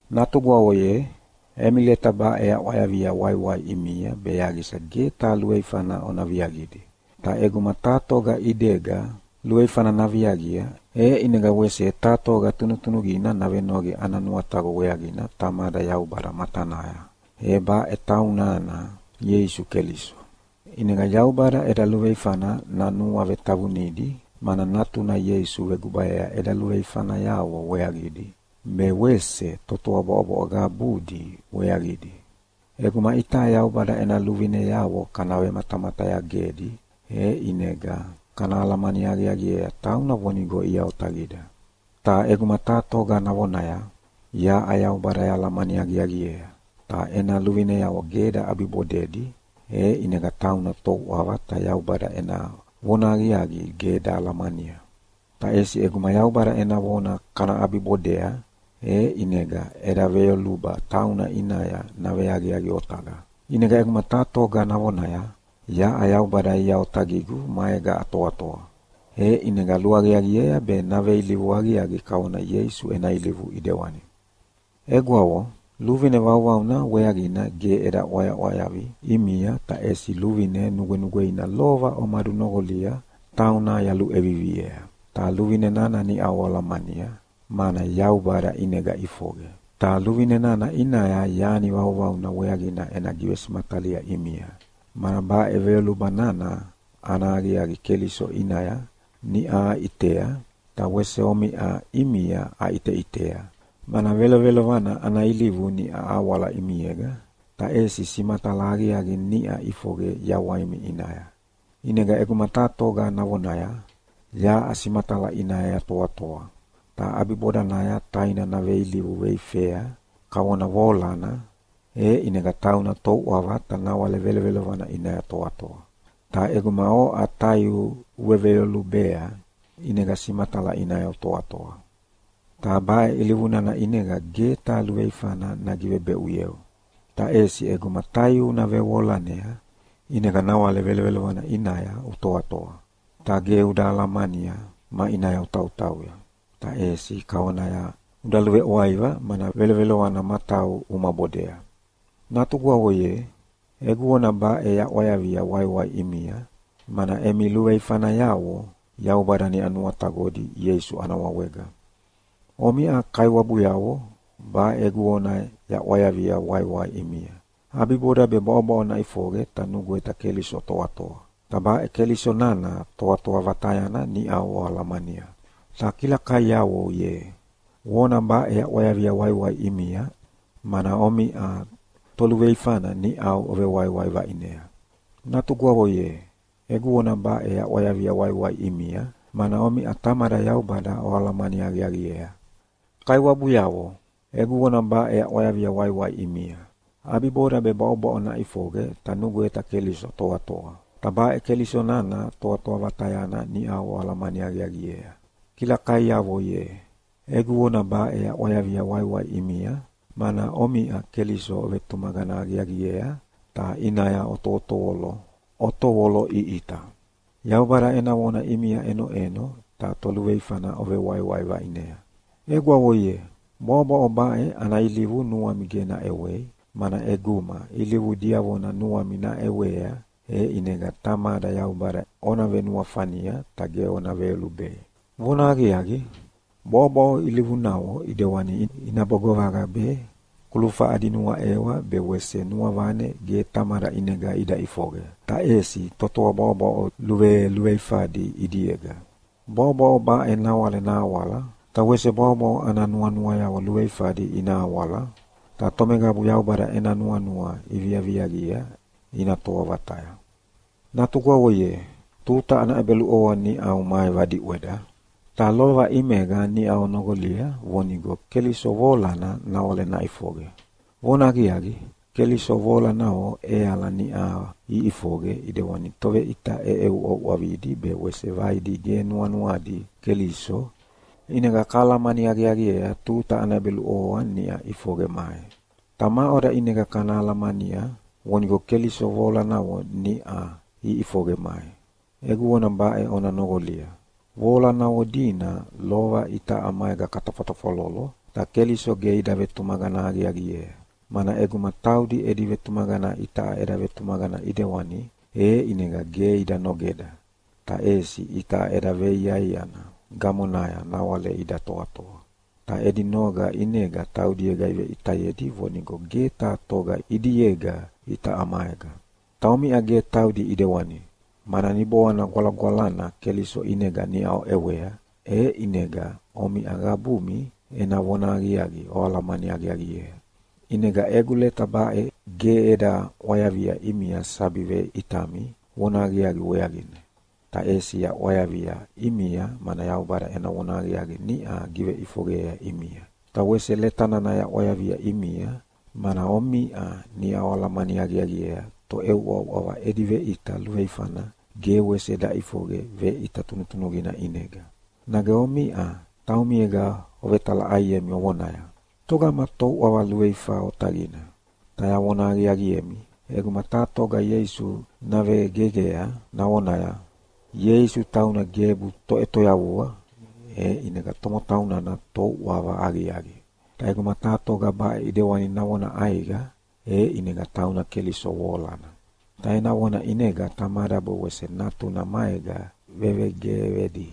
Natugwavo ye, emi leta baʼe yaʼwayavia waiwai ʼimia be yaqisa ge taha luveifana ona viaqidi. Ta ʼeguma taha toga ʼidega luveifana naviaqia, e ʼinega wese taha toga tunutunuqina navenoqi ana nuataqo weaqina Tamada Yaubada matanaya, e baʼe taunana Ieisu Keliso. ʼInega Yaubada eda luveifana nanuavetavunidi, mana Natuna Ieisu vegubayea eda luveifanayavo weaqidi, be wese totoa bwaʼobwaʼoya qabudi weaqidi. ʼEguma itaʼa Yaubada ena luvineavo kana vematamatayagedi e ʼinega kana alamani aqiaqiea tauna vonigo ia otaqida. Ta ʼeguma taha toga navonaya, “Yaʼa Yaubada yahalamani aqiaqiea”, ta ena luvineavo ge daʼabibodedi, e ʼinega tauna touʼava ta Yaubada ena vonahaqiaqi ge dahalamania. Ta ʼesi ʼeguma Yaubada ena vona kana ʼabibodea, e ʼinega eda veyoluba tauna ʼinaya naveaqiaqi otaqa. ʼInega ʼeguma taha toga navonaya, “Yaʼa Yaubada ia otaqigu maega atoatoa”, e ʼinega luaqiaqiea be naveilivu aqiaqi kavona Ieisu ena ilivu ʼidewani. Egwavo, luvine vauvauna weaqina ge eda ʼwayaʼwayavi ʼimia, ta ʼesi luvine nugwenugweina lova omadunoqolia tauna yaluʼeviviea, ta luvine nana niʼau oalamania, mana Yaubada ʼinega ʼifoqe. Ta luvine nana ʼinaya yani vauvauna weaqina ena givesimatalia ʼimia, mana baʼe veyoluba nana ana aqiaqi Keliso ʼinaya niʼa aʼitea, ta wese omiʼa ʼimia aʼiteʼitea, mana velovelovana ana ilivu niʼa awala ʼimiega, ta ʼesi simatala aqiaqi niʼa ʼifoqe yawaimi ʼinaya. ʼInega ʼeguma taha toga navonaya, “Yaʼa simatala ʼinaya yatoatoa!” ta ʼabibodanaya taina naveilivu veifea kavona voalana, e ʼinega tauna touʼava ta nawale velovelovana ʼinaya toatoa. Ta ʼeguma oʼa taiu uveveyolubea, ʼinega simatala ʼinaya utoatoa. Ta baʼe ilivu nana ʼinega ge taha luveifana nagivebeʼuyeu. Ta ʼesi ʼeguma taiu una vevoalanea, ʼinega nawale velovelovana ʼinaya utoatoa, ta ge uda alamania maʼinaya utautauya, ta ʼesi kavonaya uda luveʼwaiva, mana velovelovana matau uma bodea. Natugwavo ye, egu vona baʼe yaʼwayavia waiwai ʼimia, mana emi luveifanayavo Yaubada niʼa nuataqodi Ieisu ana wawega. Omiʼa kaiwabuyavo, baʼe egu vona yaʼwayavia waiwai ʼimia. ʼAbiboda be bwaʼobwaʼo naʼifoqe ta nugweta Keliso toatoa, ta baʼe Keliso nana Toatoa Vatayana niʼau oalamania. Ta kilakaiavo ye, vona baʼe yaʼwayavia waiwai ʼimia, mana omiʼa toluveifana niʼau ovewaiwai vaʼinea. Natugwavo ye, egu vona baʼe yaʼwayavia waiwai ʼimia, mana omiʼa Tamada Yaubada oalamani aqiaqiea. Kaiwabuyavo, egu vona baʼe yaʼwayavia waiwai ʼimia. ʼAbiboda be bwaʼobwaʼo naʼifoqe ta nugweta Keliso toatoa, ta baʼe Keliso nana Toatoa Vatayana niʼa oalamani aqiaqiea. Kilakaiavo ye, egu vona baʼe yaʼwayavia waiwai ʼimia, mana omiʼa Keliso ovetumaqana aqiaqiea ta ʼinaya otovoloʼiʼita. Yaubada ena vona ʼimia ʼenoʼeno, ta toluveifana ovewaiwai vaʼinea. Egwavo ye, bwaʼobwaʼo baʼe ana ilivu nuami ge naʼewei, mana ʼeguma ilivu diavona nuami naʼewea e ʼinega Tamada Yaubada ona venuafania ta ge ona veyolubei. Vonahaqiaqi, bwaʼobwaʼo ilivunavo ʼidewani inabo govaqa be, kulufa adi nuaʼewa be wese nuavane ge Tamada ʼinega ida ʼifoqe, ta ʼesi totoa bwaʼobwaʼo luveluveifadi ʼidiega. Bwaʼobwaʼo baʼe nawale nahawala, ta wese bwaʼobwaʼo ana nuanuayavo luveifadi ina awala, ta tomeqabu Yaubada ena nuanua iviaviaqia ina toa vataya. Natugwavo ye, tuta ana ʼebeluʼovoa niʼau mai vadiʼweda, ta lova ʼimega niʼau onoqolia vonigo Keliso voalana nawale naʼifoqe. Vonahaqiaqi, Keliso voalanavo ʼeala niʼa iʼifoqe ʼidewani toveʼita ʼeʼeuʼauʼavidi be wese vaidi ge nuanuadi Keliso. ʼInega kahalamani aqiaqiea tuta ana ʼebeluʼovoa niʼa ʼifoqe mai. Ta maʼoda ʼinega kana alamania vonigo Keliso voalanavo niʼa iʼifoqe mai? Egu vona baʼe ona noqolia: Voalanavo dina lova itaʼa maega katafwatafwalolo, ta Keliso ge ida vetumaqana aqiaqiea, mana ʼeguma taudi edi vetumaqana itaʼa eda vetumaqana ʼidewani, e ʼinega ge ida nogeda, ta ʼesi itaʼa eda veiaiana gamonaya nawale ida toatoa. Ta edi noga ʼinega taudiega iveʼitayedi vonigo ge taha toga ʼidiega itaʼa maega. Ta omiʼa ge taudi ʼidewani, mana Niboana Gwalagwalana Keliso ʼinega niʼa oʼewea, e ʼinega omiʼa qabumi ena vonahaqiaqi oalamani aqiaqiea. ʼInega egu leta baʼe ge eda ʼwayavia ʼimia sabi veʼitami vonahaqiaqi weaqina, ta ʼesi yaʼwayavia ʼimia mana Yaubada ena vonahaqiaqi niʼa giveʼifoqeyea ʼimia. Ta wese leta nana yaʼwayavia ʼimia, mana omiʼa niʼa oalamani aqiaqiea toʼeuʼauʼava edi veʼita luveifana ge wese daʼifoqe veʼita tunutunuqina ʼinega. Nage omiʼa taumiega ovetalaʼaiemi ovonaya, “Togama touʼava luveifa otaqina?” Ta yavona aqiaqiemi, ʼeguma taha toga Ieisu navegeqea navonaya, “Ieisu tauna gebu Toʼetoyavua.” e ʼinega tomotau nana touʼava aqiaqi. Ta ʼeguma taha toga baʼe ʼidewani navona ʼaiqa, e ʼinega tauna Keliso voalana. Ta ena vona ʼinega Tamada be wese Natuna maega vevegeqedi.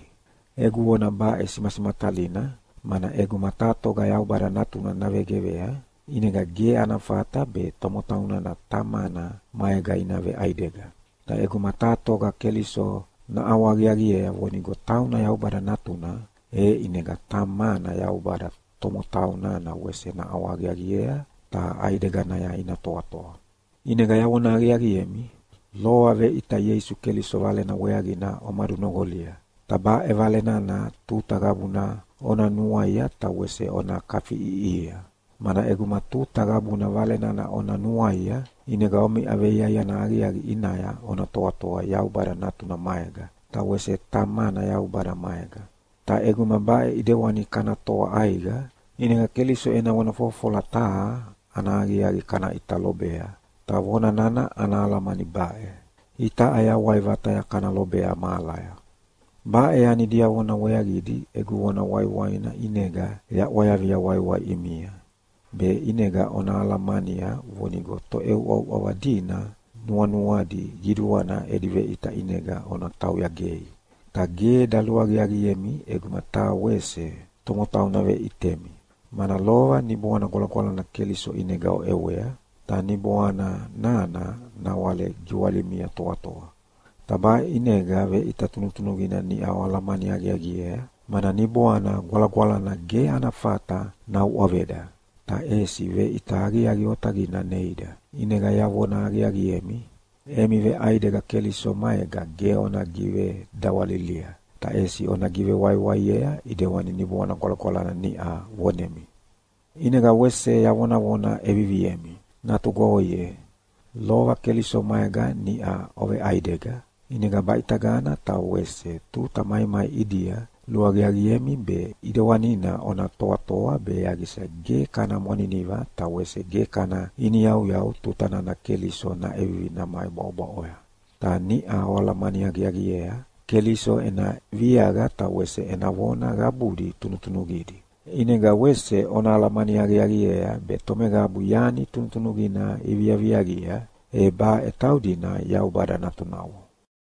Egu vona baʼe simasimatalina, mana ʼeguma taha toga Yaubada Natuna navegeqea, ʼinega ge ana fata be tomotau nana Tamana maega ina veʼaidega. Ta ʼeguma taha toga Keliso naʼawahaqiaqiea vonigo tauna Yaubada Natuna, e ʼinega Tamana Yaubada tomotau nana wese naʼawahaqiaqiea ta ʼaideganaya ina toatoa. ʼInega yavona aqiaqiemi, lova veʼita Ieisu Keliso Valena weaqina omadunoqolia, ta baʼe Vale nana tuta qabuna ona nuaia ta wese ona kafiʼiʼihia. Mana ʼeguma tuta qabuna Vale nana ona nuaia, ʼinega omiʼa veiaiana aqiaqi ʼinaya ona toatoa Yaubada Natuna maega, ta wese Tamana Yaubada maega. Ta ʼeguma baʼe ʼedewani kana toa ʼaiqa, ʼinega Keliso ena vona fofofola taha ana aqiaqi kana ʼita lobea, ta vona nana ana alamani baʼe: Itaʼa yawai vataya kana lobea mahalaya. Baʼe yani diavona weaqidi egu vona waiwaina ʼinega yaʼwayavia waiwai ʼimia, be ʼinega ona alamania vonigo toʼeuʼauʼava dina nuanuadi qiduana edi veʼita ʼinega ona tauya gei. Ta ge daluaqiaqiemi ʼeguma taha wese tomotau naveʼitemi, mana lova Niboana Gwalagwalana Keliso ʼinega oʼewea, ta Niboana nana nawale giwalimia toatoa. Ta baʼe ʼinega veʼita tunutunuqina niʼa oalamani aqiaqiea, mana Niboana Gwalagwalana ge ana fata nauʼaveda, ta ʼesi veʼita aqiaqi otaqina neida. ʼInega yavona aqiaqiemi, emi veʼaidega Keliso maega ge ona givedawalilia, ta ʼesi ona givewaiwaiea ʼidewani Niboana Gwalagwalana niʼa vonemi. ʼInega wese yavonavona ʼeviviemi: Natugwavo ye, lova Keliso maega niʼa oveʼaidega, ʼinega baʼitagana ta wese tuta maimai ʼidia luaqiaqiemi be ʼidewanina ona toatoa be yaqisa ge kana mwaniniva ta wese ge kana iniyauyau tuta nana Keliso naʼevivi namai bwaʼobwaʼoya. Ta niʼa oalamani aqiaqiea Keliso ena viaqa ta wese ena vona qabudi tunutunuqidi. ʼInega wese ona alamani aqiaqiea be tomeqabu yani tunutunuqina iviaviaqia, e baʼe taudina Yaubada natunavo.